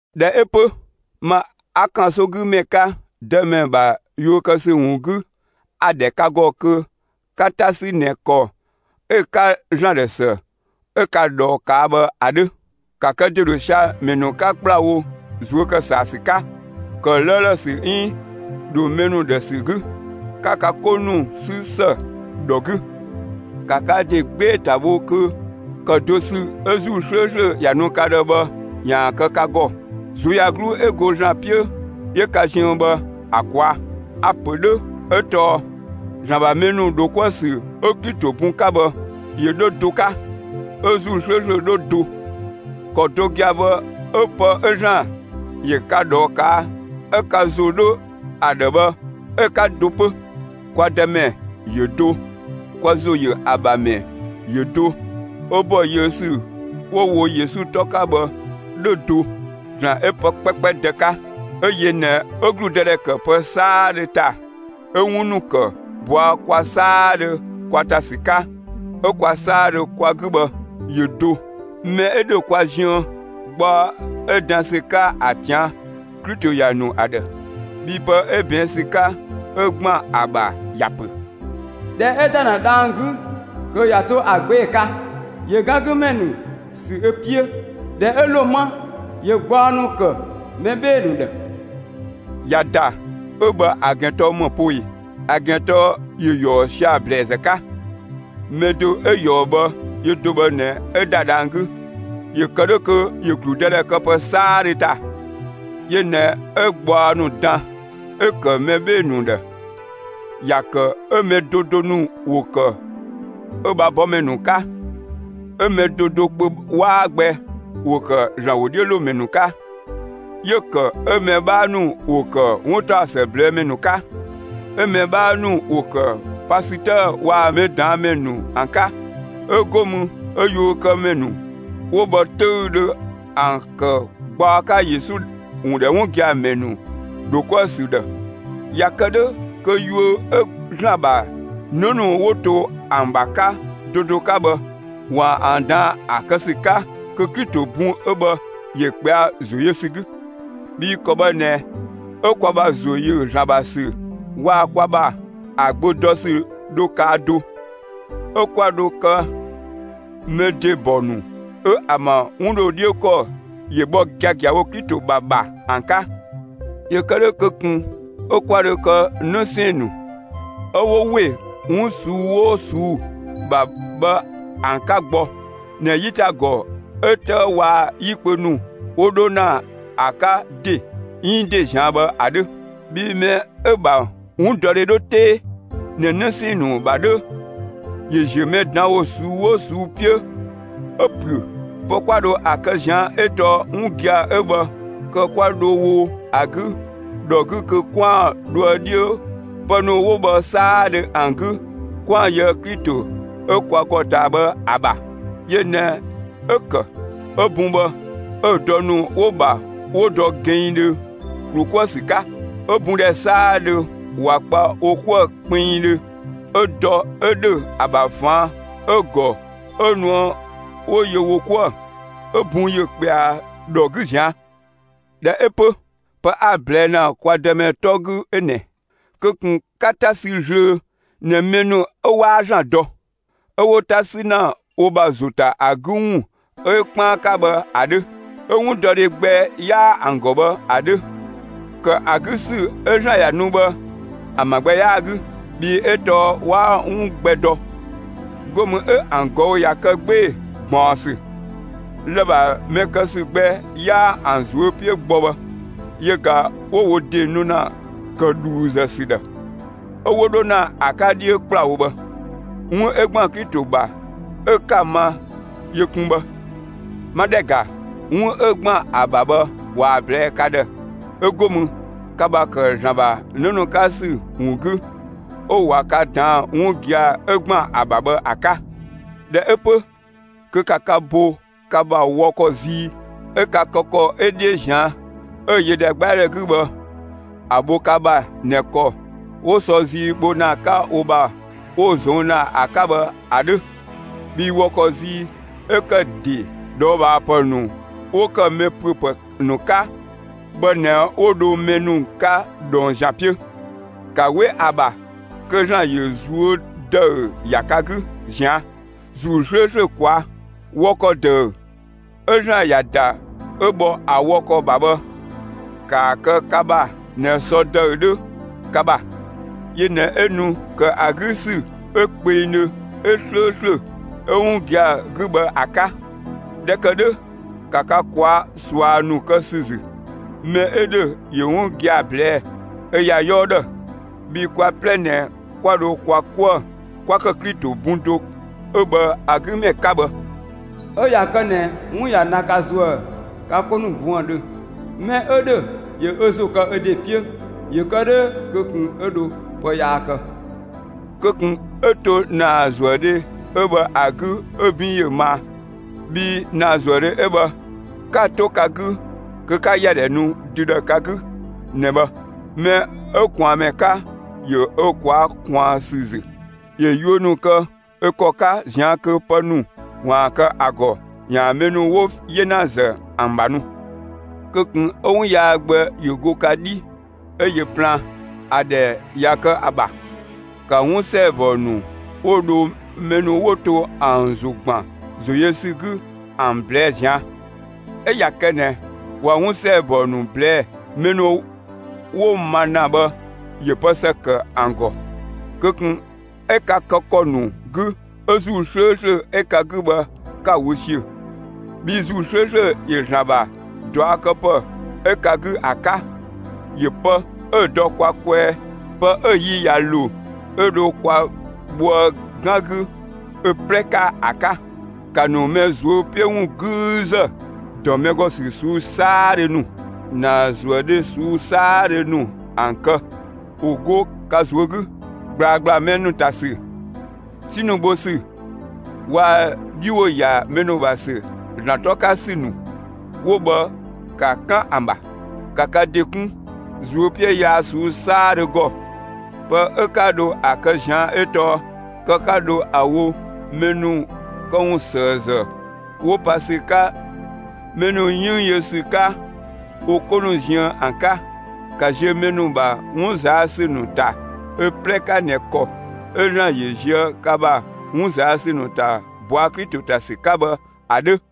꞊Dhɛ 'ö 'pö, ma 'a ‑kansogümɛ 'ka, Dëmɛ ‑bha yuö kë ‑sü ‑wun 'gü, a‑ ‑dhɛ ka ‑gɔ kö 'ka 'ta ‑sü ꞊nɛ ‑kɔ 'ö‑ 'ka ‑Zlan ‑dhë ‑së 'ö ka ꞊dhɔɔ ꞊kaa' bhë ‑a 'dhö. ‑Ka kë ‑de ‑dho sia‑ ‑mɛ ‑nu 'ka ‑kplawo ꞊zuö' ‑kë ‑saa ‑sü 'ka, ‑kë 'lëëlë ‑sü 'iin ‑dho mɛ ‑nu ‑dhë ‑sü 'gü. 'Ka ka 'ko ‑nu 'sü ‑së ‑dhɔ 'gü. ‑Ka ka ‑de 'gbee‑ ‑ta bho kö ‑kë do ‑sü 'ö ‑Zuu 'slööslö ‑ya nu ka ‑dhë bhë ‑yaan kë ka ‑gɔ, ꞊zuöyagluu 'ö go ‑Zlan 'piö 'yö ka ziën bhë ‑a ꞊kwaa'. A‑ ‑pö 'dhö 'ö tɔɔ ‑Zlan ‑bha mɛ ‑nu ‑dho 'kuë‑ ‑sü 'ö Klito bun 'ka bhë, ‑yö 'dhö do 'ka, 'ö ‑Zuu 'slööslö 'dhö do. ‑Kɔ do gia‑ bhë 'ö pë 'ö ‑Zlan ‑yö ka ꞊dhɔɔ ꞊kaa' 'ö ka ‑zo 'dhö ‑a ‑dhë bhë 'ö‑ 'ka do 'pö. Kwa Dëmɛ ‑yö do; kwa ‑zo yö ‑a ‑bha ‑mɛ ‑yö do, 'ö ‑bɔ yiö ‑sü 'wo‑ wo Yesu 'tɔ 'ka bhë 'dhö do; ‑Zlan 'ö pë 'kpɛkpɛ Dë 'ka, 'ö yö ꞊nɛ 'ö ‑gludëdhɛ ‑kë pë 'saadhö ‑ta, 'ö 'wun ‑nu ‑kë ꞊bɔa' kwa 'saadhö kwa ‑ta ‑sü 'ka, 'ö kwa 'saadhö kwa 'gü bhë, ‑yö do. Mɛ 'ö ‑dhö kwa ziën, gbaɔ 'ö dan ‑sü 'ka ‑a ꞊tian', Klito ‑ya ‑nu ‑a ‑dhë. Bhii pë 'ö ꞊bɛɛn' ‑sü 'ka 'ö ‑gban ‑a ‑bha ‑ya ‑pö: ꞊Dhɛ 'ö ‑da ‑na dhang‑ 'gü, kö ꞊ya 'to ‑a 'gbee‑ 'ka, ‑yö 'gan 'gü ‑mɛ ‑nu ‑sü ö 'piö. ꞊Dhɛ 'ö ‑lo 'ma, ‑yö gbaɔ ‑nu ‑kë mɛ 'bhee‑ ‑nu ‑dhë. «꞊Ya ‑da» 'ö bhë ‑a ‑gɛn tɔɔ ‑më poo ꞊e? ‑A ‑gɛn tɔɔ ‑yö ‑yɔɔ sia‑ ‑blɛɛzë 'ka. Mɛ do 'ö ꞊yɔɔ bhë, yö do bhë ꞊nɛ 'ö ‑da dhang‑ 'gü, ‑yö kë 'dhö kö ‑yö ‑gludëdhɛ kë pë 'saadhö ‑ta. Yö ꞊nɛ 'ö gbaɔ ‑nu dan 'ö‑ ‑kë mɛ 'bhee‑ ‑nu ‑dhë; ‑ya ‑kë 'ö mɛ do do ‑nu ‑wo ‑kë ö ‑bha bɔmɛ ‑nu 'ka, 'ö mɛ do do kpö 'waa gbɛ ‑wo ‑kë ‑Zlan ‑wodhiölomɛ ‑nu 'ka; 'yö‑ ‑kë 'ö mɛ 'bhaa ‑nu ‑wo ‑kë 'wuntaɔsë ꞊blɛɛ' ‑mɛ ‑nu 'ka; 'ö mɛ 'bhaa ‑nu ‑wo ‑kë pasütëë waa‑ mɛ ꞊daan' ‑mɛ ‑nu ‑an 'ka. 'ö 'go mü 'ö yuökëmɛ ‑nu 'wo bhë 'töüdhö ‑an ‑kë gbaɔ 'ka Yesu ‑wun ‑dhɛ 'wun gia‑ ‑mɛ ‑nu ‑dho 'kuë‑ ‑sü ‑dhë. ‑Ya ‑kë 'dhö kö yuö 'ö ‑Zlan ‑bha 'në ‑nu 'wo to ‑an ‑bha 'ka do do 'ka bhë, ‑waan ‑an ꞊daan'‑ ‑a kë ‑sü 'ka kö Klito bun 'ö bhë ‑yö ꞊kpɛa'‑ ‑zo yö ‑sü 'gü. Bhii ‑kɔ bhë ꞊nɛ 'ö kwa ‑bha ‑zo ‑yö ‑Zlan ‑bha ‑sü waa‑ kwa ‑bha ‑a Gbö dɔ ‑sü dho kaa do, 'ö 'kwa ‑dho kë mɛ ‑de ‑bɔ ‑nu 'ö ‑an ‑bha 'wun ‑dho 'dhiö ‑kɔ ‑yö bhɔ giagiawo Klito ‑bha ‑bha ‑an 'ka. ‑Yö kë 'dhö kö ꞊kun 'ö 'kwa dho kë 'në 'sɛɛn‑ ‑nu 'ö 'wo ‑we 'wun ꞊suu'‑ 'oo ꞊suu'‑ ‑bha bhë ‑an 'ka gbɔ ꞊nɛ 'yitagɔ 'ö 'tëë waa‑ 'yi kpö ‑nu 'wo dho ‑na ‑a 'ka ‑de 'iin ‑de zian bhë ‑a 'dhö. Bhii mɛ 'ö‑ ‑bha 'wundɔdhe 'dho 'tee ꞊nɛ 'në 'sɛɛn‑ ‑nu ‑bha 'dhö, ‑yö ‑ziö mɛ ꞊daan' ‑wo ꞊suu'‑ 'oo ꞊suu'‑ 'piö 'ö ‑püö. Pë 'kwa dho ‑a kë ꞊zian' 'ö tɔɔ 'wun gia‑ 'ö bhë kë 'kwa dho wo ‑a 'gü ‑dhɔ 'gü kö 'kwaan‑ dhoë 'dhiö pë ‑nu 'wo bhë 'saadhö ‑an 'gü 'kwaan‑ yöë Klito 'ö kwa ‑gɔ ꞊taa bhë ‑a ‑bha. Yö ꞊nɛ 'ö‑ ‑kë 'ö bun bhë 'ö‑ dɔ ‑nu 'wo‑ ‑bha 'wo dɔ gɛnngdhö ‑klu 'kuë‑ ‑sü 'ka; 'ö bun ‑dhɛ 'saadhö ꞊wa kpa wo 'kuë‑ kpinngdhö, 'ö dɔ 'ö ‑dhö ‑a ‑bha ꞊faan' 'ö‑ ‑gɔ 'ö nuë 'wo yö wo 'kuë‑ 'ö bun ‑yö ꞊kpɛa ‑dhɔ 'gü ꞊zian'. ꞊Dhɛ 'ö 'pö, pë 'a‑ ꞊blɛɛ' ‑na kwa Dëmɛ 'tɔ 'gü 'ö ꞊nɛ: Kö ꞊kun 'ka 'ta sü zlöö ꞊nɛ mɛ ‑nu 'ö 'waa ‑Zlan dɔ, 'ö 'wo 'ta 'sü ‑na wo ‑bha ‑zo ‑ta ‑a 'gü ‑wun 'ö 'kpaan 'ka bhë ‑a 'dhö, 'ö 'wundɔdhe gbɛ 'yaa ‑an ‑gɔ bhë ‑a 'dhö. ‑Kë ‑a 'gü ‑sü 'ö ‑Zlan ‑ya nu bhë ‑an ‑bha gbɛ 'yaa‑ 'gü, bhii 'ö tɔɔ 'waa 'wun gbɛ dɔ, 'go mü 'ö ‑an ꞊gɔü' ꞊ya kë 'gbee‑ ꞊gbaɔnsü. Lë‑ ‑bha mɛ kë ‑sü gbɛ 'yaa ‑an ꞊zuö' 'piö gbɔ bhë, yö ꞊ga 'wo wo ‑de nu ‑na ‑kë ‑dhuuzë ‑sü ‑dhë, 'ö 'wo 'dho ‑na ‑a 'ka 'dhiö ‑kplawo bhë. 'Wun 'ö ‑gban Klito ‑bha 'ö 'ka‑ ma yö kun bhë. 'Ma ‑dhɛ ‑ga, 'wun 'ö ‑gban ‑a ‑bha bhë ꞊waa‑ ꞊blɛɛ'‑ ka ‑dhë, 'ö go mü, ka ‑bha ‑kë ‑Zlan ‑bha 'në ‑nu 'ka ‑sü ‑wun 'gü, 'ö ꞊wa ka ꞊daan'‑ 'wun gia‑ 'ö ‑gban ‑a ‑bha bhë ‑a 'ka. ꞊Dhɛ 'ö 'pö, kö ‑ka ka bo ka ‑bha wɔ ‑kɔ zii 'ö ka kë ‑kɔ 'ö 'dhiö ꞊zian' 'ö‑ yö ‑dhɛgbɛadhɛ 'gü bhë ‑a bho ka ‑bha ꞊nɛ ‑kɔ 'wo sɔ zii bho ‑na 'ka wo ‑bha 'wo‑ ꞊zong' ‑na ‑a 'ka bhë ‑a 'dhö! Bhii wɔ ‑kɔ zii 'ö ‑kë ‑de ꞊dhɔɔbhaapë ‑nu 'wo ‑kë mɛ ‑püö ‑pë ‑nu 'ka bhë ꞊nɛ 'wo dho mɛ ‑nu 'ka ꞊dhɔng ‑zian 'piö. ‑Ka 'we ‑a ‑bha kö ‑Zlan ‑yö ꞊zuö' ‑dëü ‑ya ka 'gü ꞊zian' ‑Zuu 'slööslö ꞊kwaa'. Wɔ ‑kɔ ‑dëü 'ö ‑Zlan ‑ya ‑da 'ö bhɔ ‑a wɔ ‑kɔ ‑bha bhë, ‑kaa kë ka ‑bha ꞊nɛ sɔ ‑dëü 'dhö ka ‑bha. Yö ꞊nɛ 'ö nu ‑kë ‑a 'gü ‑sü 'ö kpengdhö, 'ö 'slööslö, 'ö 'wun gia‑ 'gü bhë ‑a 'ka. ꞊Dhɛ ‑kë 'dhö, ‑ka ka ꞊kwaa'‑ ꞊sua ‑nu kë ‑sü ‑zü; mɛ 'ö ‑dhö ‑yö 'wun gia‑ ꞊blɛɛ'‑ ö ‑ya 'yɔɔ ‑dhë. Bhii kwa 'plɛ ꞊nɛ 'kwa 'dho kwa 'kuë‑ 'kwa kë Klito bun do 'ö bhë ‑a 'gü ‑mɛ 'ka bhë. 'Ö ꞊ya kë ꞊nɛ 'wun ꞊ya na ka ‑zuë ka 'ko ‑nu buëndhö, mɛ 'ö 'dhö ‑yö ö ‑zo kë ö ‑de 'piö ‑yö kë 'dhö kö ꞊kun 'ö dho pë yaa kë; kö ꞊kun 'ö to ‑naazuëdhe 'ö bhë ‑a 'gü 'ö 'bin ‑yö maa. Bhii ‑naazuëdhe 'ö bhë, 'ka‑ 'to ka 'gü kö 'ka ‑ya ‑dhɛ nu dü ‑dhë ka 'gü ꞊nɛ bhë! Mɛ 'ö ꞊kwaanmɛ 'ka ‑yö ö ꞊kwaa'‑ ꞊kwaan ‑sü ‑zü; ‑yö yuö ‑nu kë ö ‑kɔ 'ka ꞊zian' kö pë ‑nu ‑waan kë ‑a ‑gɔ ‑yaan mɛ ‑nu 'wo 'yenazë ‑an ‑bha nu. Kö ꞊kun 'ö 'wun yaa gbɛ ‑yö 'go ka 'dhi 'ö yö plaan! ‑A ‑dhɛ ꞊ya kë ‑a ‑bha, ‑ka 'wun ‑sɛɛbɔ ‑nu 'wo dho mɛ ‑nu 'wo to ‑an ‑zo ‑gban ‑zo yö ‑sü 'gü ‑an ꞊blɛɛ'‑ ꞊zian'. 'Ö ꞊ya kë ꞊nɛ ꞊wa 'wun ‑sɛɛbɔ ‑nu ꞊blɛɛ'‑, mɛ ‑nu 'wo‑ ma ‑na bhë ‑yö pë ‑së ‑kë ‑an ‑gɔ. Kö ꞊kun 'ö ka kë ‑kɔ ‑nu 'gü 'ö ‑Zuu 'slööslö 'ö ka 'gü bhë 'ka‑ wö ‑siö! Bhii ‑Zuu 'slööslö ‑yö ‑Zlan ‑bha ꞊duakëpë 'ö ka 'gü ‑a 'ka; ‑yö pë 'ö‑ dɔ kwa kwɛɛ, pë 'ö‑ yi ꞊ya ‑lo 'ö dho kwa bhoë 'gan 'gü ö 'plɛ 'ka ‑a 'ka. ‑Ka ‑nu mɛ ꞊zuö' 'piö ‑wun 'güüzë, ‑dɔ mɛ ‑gɔ ‑sü ꞊suu'‑ 'saadhö ‑nu, ‑naazuëdhe ꞊suu'‑ 'saadhö ‑nu ‑an kë, ‑wo 'go ka ꞊zuö' 'gü! ꞊Gblaa 'gbla mɛ ‑nu ‑ta ‑sü, 'si ‑nu bho ‑sü waa‑ 'dhi ‑wo ‑ya mɛ ‑nu ‑bha ‑sü ‑Zlan 'tɔ 'ka ‑sü ‑nu 'wo bhë, ‑ka 'kan ‑an ‑bha! ‑Ka ka ‑de 'kun ꞊zuö' 'piö yaa ꞊suu'‑ 'saadhö ‑gɔ! Pë 'ö 'ka dho ‑a kë ꞊zian' 'ö tɔɔ kë 'ka dho ‑a wo mɛ ‑nu këwunsëëzë 'wo pa ‑sü 'ka mɛ ‑nu 'yënng yö ‑sü 'ka wo 'ko ‑nu ziën ‑an 'ka! ‑Ka ziö mɛ ‑nu ‑bha 'wun ꞊zaa' ‑sü ‑nu ‑ta ö 'plɛ 'ka ꞊nɛ ‑kɔ 'ö ‑Zlan ‑yö ꞊zië' ka ‑bha 'wun ꞊zaa' ‑sü ‑nu ‑ta ꞊bɔa' Klito ‑ta ‑sü 'ka bhë ‑a 'dhö.